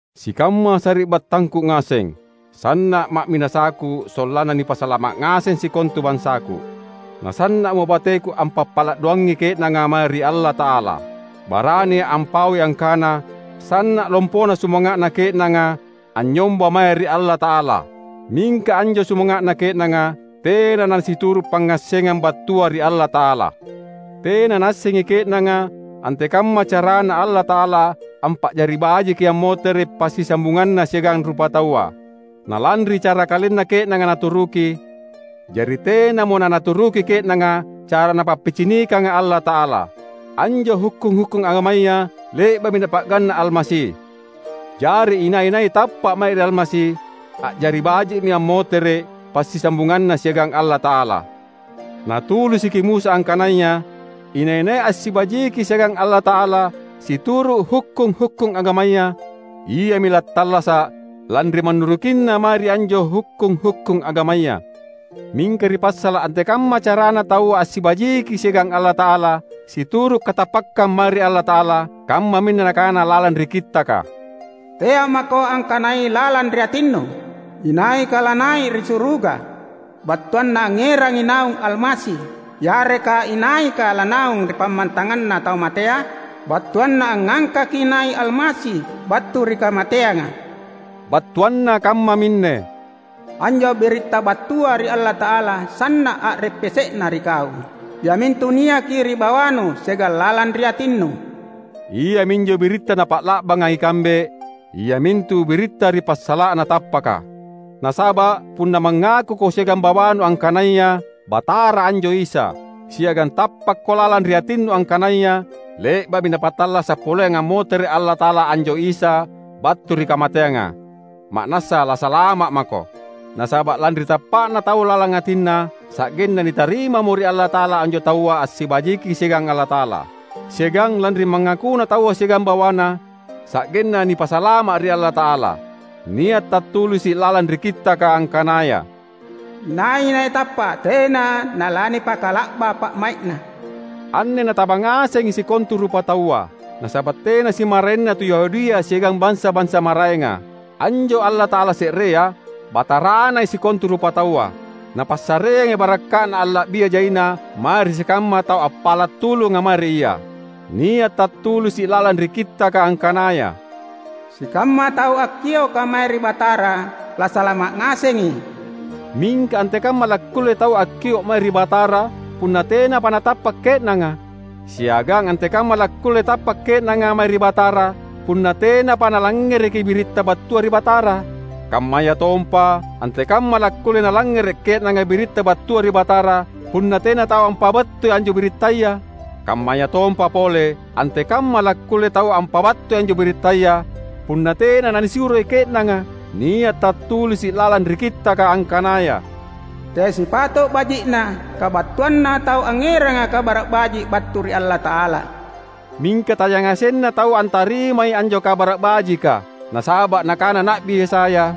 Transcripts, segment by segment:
Sikamma sari’battangku ngaseng! Sanna’ ma’minasaku sollanna nipasalama’ ngaseng sikontu bansaku. Nasanna’mo bateku ampappala’ doangangi ke’nanga mae ri Allata’ala. Barania’ ampaui angkana sanna’ lompona sumanga’na ke’nanga anynyomba mae ri Allata’ala. Mingka anjo sumanga’na ke’nanga tena nasituru’ pangngassengang battua ri Allata’ala. Tena naassengi ke’nanga antekamma caraNa Allata’ala ampa’jari bajiki ammotere’ passisambunganNa siagang rupataua. Nalanri cara kalenna ke’nanga naturuki, jari tenamo nanaturuki ke’nanga cara Napappicinikanga Allata’ala. Anjo hukkung-hukkung agamaya le’ba’mi Napa’ganna’ Almasi. Jari inai-nai tappa’ mae ri Almasi, a’jari baji’mi ammotere’ passisambunganna siagang Allata’ala. Natulisiki Musa angkanaya inai-nai assibajiki siagang Allata’ala situru’ hukkung-hukkung agamaya, iami lattallasa’ lanri mannurukinna mae ri anjo hukkung-hukkung agamaya. Mingka ri passala’ antekamma carana taua assibajiki siagang Allata’ala situru’ katappakkang mae ri Allata’ala, kammaminne nakana lalang ri Kittaka, "Tea’ mako angkanai lalang ri atinnu, ‘Inaika lanai’ ri suruga?’ (battuanna angngerangi naung Almasi), yareka ‘Inaika lanaung ri pammantanganna tau matea?’ (battuanna angngangkaki nai’ Almasi battu ri kamateanga.)" Battuanna kammaminne, "Anjo biritta battua ri Allata’ala sanna’ a’reppese’na ri kau; iamintu niaki ri bawanu siagang lalang ri atinnu." Iaminjo biritta napa’la’banga ikambe; iamintu biritta ri passala’na tappaka. Nasaba’ punna mangakuko siagang bawanu angkanaya, "Batara anjo Isa," siagang tappakko lalang ri atinnu angkanaya le’ba’mi Napattallasa’ poleang ammotere’ Allata’ala anjo Isa battu ri kamateanga, ma’nassa lasalama’ mako. Nasaba’ lanri tappa’na taua lalang atinna, sa’genna nitarimamo ri Allata’ala anjo taua assibajiki siagang Allata’ala. Siagang lanri mangakuna taua siagang bawana, sa’genna nipasalama’ ri Allata’ala. Nia’ tattulisi’ lalang ri Kittaka angkanaya, "Inai-nai tappa’ tena nalanipakala’ba pa’mai’na." Anne nataba ngasengi sikontu rupataua; nasaba’ tena simmaraenna tu Yahudia siagang bansa-bansa maraenga. Anjo Allata’ala se’rea, Bataranai sikontu rupataua. Napassareangi barakka’Na alla’bia jaina mae ri sikamma tau appala’ tulunga mae ri Ia. Nia’ tattulisi’ lalang ri Kittaka angkanaya, "Sikamma tau akkioka mae ri Batara lasalama’ ngasengi." Mingka antekamma lakkulle taua akkio’ mae ri Batara punna tenapa natappa’ ke’nanga? Siagang antekamma lakkulle tappa’ ke’nanga mae ri Batara punna tenapa nalangngereki biritta battua ri Batara? Kammayatompa, antekamma lakkulle nalangngere’ ke’nanga biritta battua ri Batara punna tena tau ampabattui anjo birittaya? Kammayatompa pole, antekamma lakkulle taua ampabattui anjo birittaya punna tena nanisuroi ke’nanga? Nia’ tattulisi’ lalang ri Kittaka angkanaya, "Teai sipato’ baji’na kabattuanna tau angngeranga Kabara’ Baji’ battu ri Allata’ala." Mingka tayangasenna taua antarimai anjo Kabara’ Bajika. Nasaba’ nakana Na’bi Yesaya,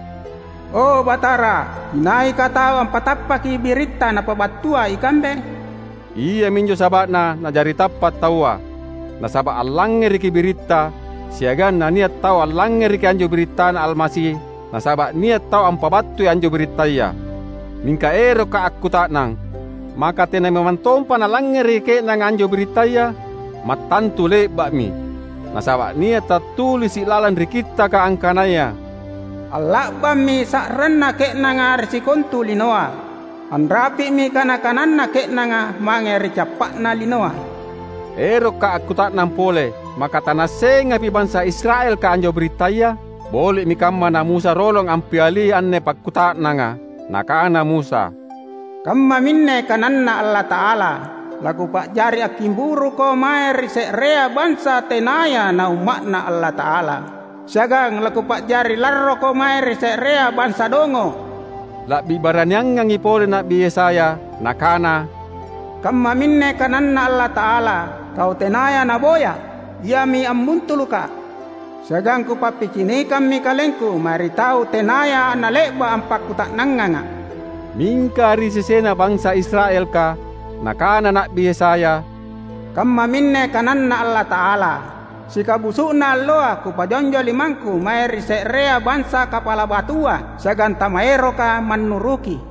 "O, Batara, inaika tau ampatappaki biritta napabattua ikambe?" Iaminjo saba’na na’jari tappa’ taua, nasaba’ allangngereki biritta, siagang nania’ tau allangngereki anjo birittaNa Almasi nasaba’ nia’ tau ampabattui anjo birittaya. Mingka erokka’ akkuta’nang: Maka tena memang tompa nalangngereki ke’nanga anjo birittaya? Mattantu le’ba’mi! Nasaba’ nia’ tattulisi’ lalang ri Kittaka angkanaya, "Alla’bammi sa’ranna ke’nanga ri sikontu linoa, anrapi’mi kana-kananna ke’nanga mange ri cappa’na linoa!" Erokka’ akkuta’nang pole: Maka tanaassengapi bansa Israelka anjo birittaya? Boli’mi kamma na Musa rolong ampiali anne pakkuta’nanga. Nakana Musa, "Kammaminne kananNa Allata’ala, ‘LaKupa’jari akkimburuko mae ri se’rea bansa tenaya naUmma’Na Allata’ala siagang laKupa’jari larroko mae ri se’rea bansa dongo’.’" La’bi baraniangangi pole Na’bi Yesaya. Nakana, "Kammaminne kananNa Allata’ala, ‘Tau tenaya naboyA’, iami ambuntulukKa’; siagang Kupappicinikammi KalengKu mae ri tau tenaya nale’ba’ ampakkuta’nangangA’.’" Mingka ri sesena bansa Israelka, nakana Na’bi Yesaya, "Kammaminne kananNa Allata’ala, ‘Sikabusu’na alloa Kupajonjo limangKu mae ri se’rea bansa kapala batua siagang tamaeroka mannuruki.’"